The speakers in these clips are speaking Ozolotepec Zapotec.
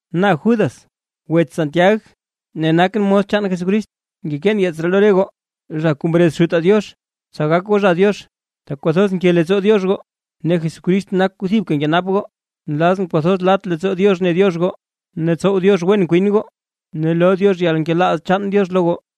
Na nak Judas, wets Santiag ne nakʼn mos chaan Jesucrist. Ngekeen yeets ree lo re goo, zha kuu mrez Xutaa Diox, tsa gak goo zha Diox, tak kwathoz nke leettsoo Diox goo. Ne Jesucrist nak kuu thibka nkenap goo. Nlazʼn kwathoz lat leettsoo Diox ne Diox goo, ne tsow Diox wen kwin goo, ne loo Diox yalnkelaaz chaan Diox lo goo.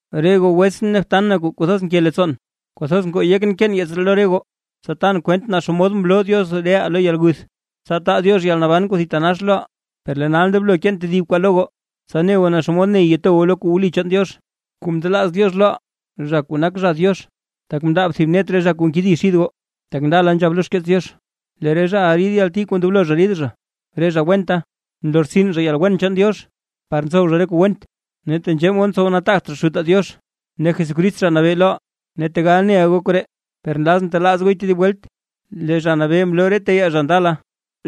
Re goo wetsʼn ne btan na kuu kwathoz nke leettsoon, kwathoz ngoo yekʼn keen yeets ree lo re goo, tsa tan kwent naa xomod mloo Diox reʼaa lo yalguth, tsa taa Diox yalnaban kuu thitanax loʼaa; per lee nal ndoblo keen tedib kwaa lo goo, tsa ne goo naa xomod ney to goo lo kuu wli chaan Diox, kuu mndelaaz Diox loʼaa, zha kuu nak zha Diox. Tak mndaab thib net re zha kuu nkedi xid goo, tak ndala nzhab lo xkeets Diox, lee re zhaʼa rid yalti kuu ndoblo zha rid zha. Re zha wenta, nlortsin zha yalwen chaan Diox par ntsow zha re kuu went; ne tenzhee mod ntsow nataagt zha Xutaa Diox ne Jesucrist Zha Nabee loʼaa. Ne tegal neʼa goo koree, per nlazʼn telaaz gooy tedib welt: Lee Zha Nabee mloo re teyaa zha ndala,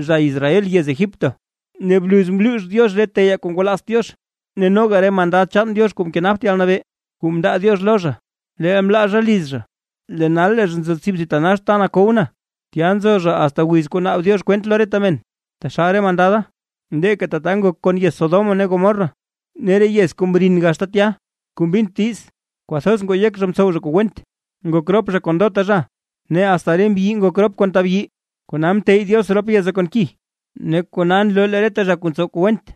zha Israel yez Egipto, ne bluz mluux Diox re teyaa kuu ngwalaazt Diox. Ne noga re mandad chaan Diox kuu mkenapt yalnabee kuu mndaa Diox lo zha, leel mlaa zha liz zha, lee nal lee zha nzo tsib thitanax ta nakow na, tya nzo zha asta wiz kuu naab Diox kwent lo reta men. Taxal re mandada, leeka tata ngok kon yez Sodoma ne Gomorra ne re yez kuu mrin gaxta tya kuu mbint diiz, kwathoz ngoo yek zha mtsow zha kuu went, ngok rop zha kon ndota zha, ne asta re mbyi ngok rop kon tabyi. Kona mteyy Diox rop yeza kon ki, ne kona nloo lee reta zha kuu ntsow kuu went,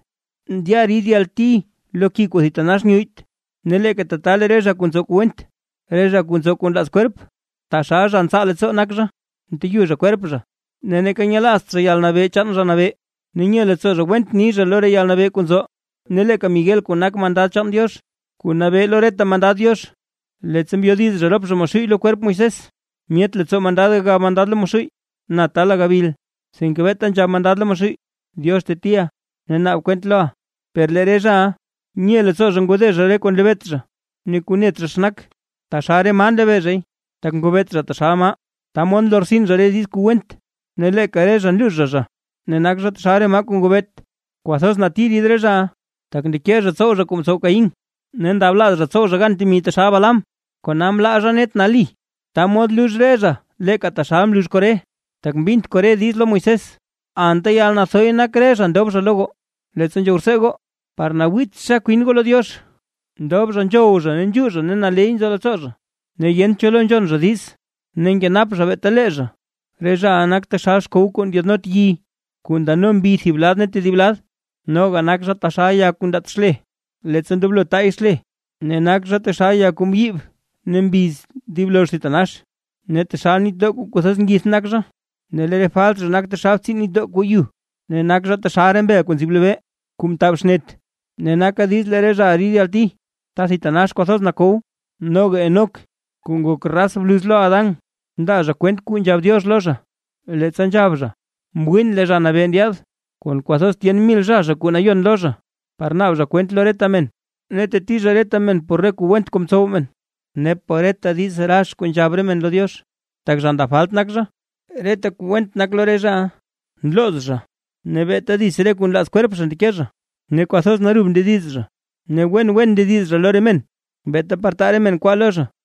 ndya rid yalti lo ki kuu thitanax nyuyyt. Ne leeka tata re zha kuu ntsow kuu went, re zha kuu ntsow kuu nlaaz kwerp, taxal zha ntsaa leettsoo nak zha, nteyu zha kwerp zha, ne neeka nyelaazt zha yalnabee chaan Zha Nabee, ne nye leettsoo zha went ni zha lo re yalnabee kuu nzo. Ne leeka Miguel kuu nak mandad chaan Diox, kuu nabee lo reta mandad Diox, leettsa mbyodiz zha kon Maxuuy lo kwerp Moisés, myet leettsoo mandad gagab mandad lo Maxuuy na taala gabil, sinke beeta nzhab mandad lo Maxuuy: “Diox tetiʼa, ne naab kwent loʼa”. Per lee re zhaʼa, nye leettsoo zha ngode zha re kuu nlebeet zha ne kuu net zha xa nak, taxal re maa nlebee zhay, tak ngobeet zha taxal maa, ta mod nlortsin zha re diiz kuu went ne leeka re zha nluux zha zha, ne nak zha taxal re maa kuu ngobeet. ¡Kwathoz nati rid re zhaʼa! Tak ndeke zha tsow zha kuu mtsow Caín. Ne ndablaaz zha tsow zha gan temi taxal Balaam, kona mlaa zha net nali, ta mod lux re zha leeka taxal mlux Coré, tak mbint Coré diiz lo Moisés. Anta yalnathoy nak re zha ndob zha lo goo, leettsa nzhow rtsee goo par nawiitxa kwin goo lo Diox, ndob zha nzhow zha ne nzhuu zha ne naley nyoo leettsoo zha, ne yent cho lo nzhon zha diiz, ne nkenap zha beeta lee zha. Re zhaʼa nak taxal xkow kuu ndyaadnot yi, kuu ndano mbi thib lad ne tedib lad. Noga nak zha taxal ya kuu ndaat xle, leettsa ndoblo taay xle, ne nak zha taxal ya kuu mbyiib ne mbiz dib lozh thitanax. Ne taxal nitdoo kuu nathoz ngith nak zha, ne lee re falt zha nak taxal re btsiin nitdoo kuu yu. Ne nak zha taxal re mbel kuu nzib lobee kuu mtab xnet; ne naka diiz lee re zhaʼa rid yalti ta thitanax kwathoz nakow. Noga Enoc kuu ngok gaz raz bluz lo Adán, mndaa zha kwent kuu nzhab Diox lo zha; leettsa nzhab zha: “Mwiin lee Zha Nabee ndyaad, kon kwathoz tyen mil zha zha kuu nayon lo zha, par naab zha kwent lo reta men, ne teti zha reta men por reta kuu went mtsow men, ne por reta diiz rax kuu nzhab re men lo Diox, tak zha ndab falt nak zha.” Reta kuu went nak lo re zhaʼa, nlooz zha ne beeta dits re kuu nlaaz kwerp zha ndeke zha, ne kwathoz narub ndediz zha, ne wen ndediz zha lo re men beeta par taa re men kwaa lo zha.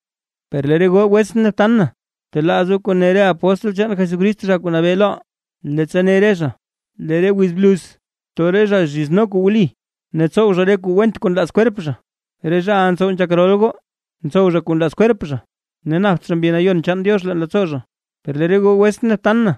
Per lee re goo wetsʼn ne btan na, btelaaz goo re kuu ne re apóstl chaan Jesucrist Zha Nabee loʼaa, leettsa ne re zha: “Lee re wiz bluz too re zha kuu zhizno kuu wli, ne tsow zha re kuu went kuu nlaaz kwerp zha”. Re zhaʼa ntsow nzhak rol goo; ntsow zha kuu nlaaz kwerp zha ne napt zha Mbi Nayon chaan Diox leen leettsoo zha. Per lee re goo wetsʼn ne btan na,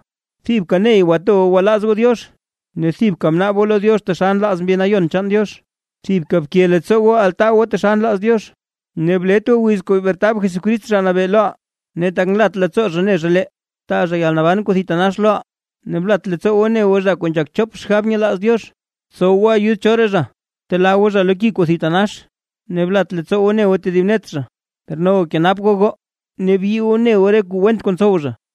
thibka ney bto goo gwalaaz goo Diox. Ne thibka bnaab goo lo Diox taxal nlaaz Mbi Nayon chaan Diox. Thibka bke leettsoo goo altaa goo taxal nlaaz Diox, ne blet goo wiz kuu bretab Jesucrist Zha Nabee loʼaa, ne tak nlat leettsoo zha ne zha lee, taa zha yalnaban kuu thitanax loʼaa. Ne blat leettsoo goo bne goo re zha kuu nzhak chop xgab nyelaaz Diox. Btsow goo ayud choraa zha, btelaa goo zha lo ki kuu thitanax. Ne blat leettsoo goo bne goo tedib net zha, per noga kenap goo goo, ne byii goo bne goo re kuu went kuu ntsow re zha.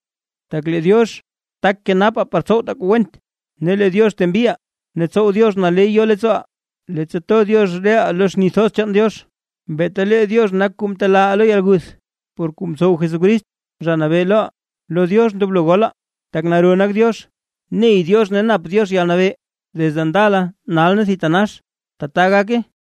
Tak lee Diox tak kenapaa tsa tsowtaa kuu went, ne lee Diox tembiʼaa ne tsow Diox naley yo leettsooʼaa, leettsa to Diox reʼaa lo xni thoz chaan Diox. Beeta lee Diox nak kuu mtelaaʼaa lo yalguth por kuu mtsow Jesucrist, Zha Nabee loʼaa. Lo Diox ndoblo golaa, tak naro Diox, ney Diox, ne nap Diox yalnabee, desde ndala, nal ne thitanax. ¡Tbaa gake! Judas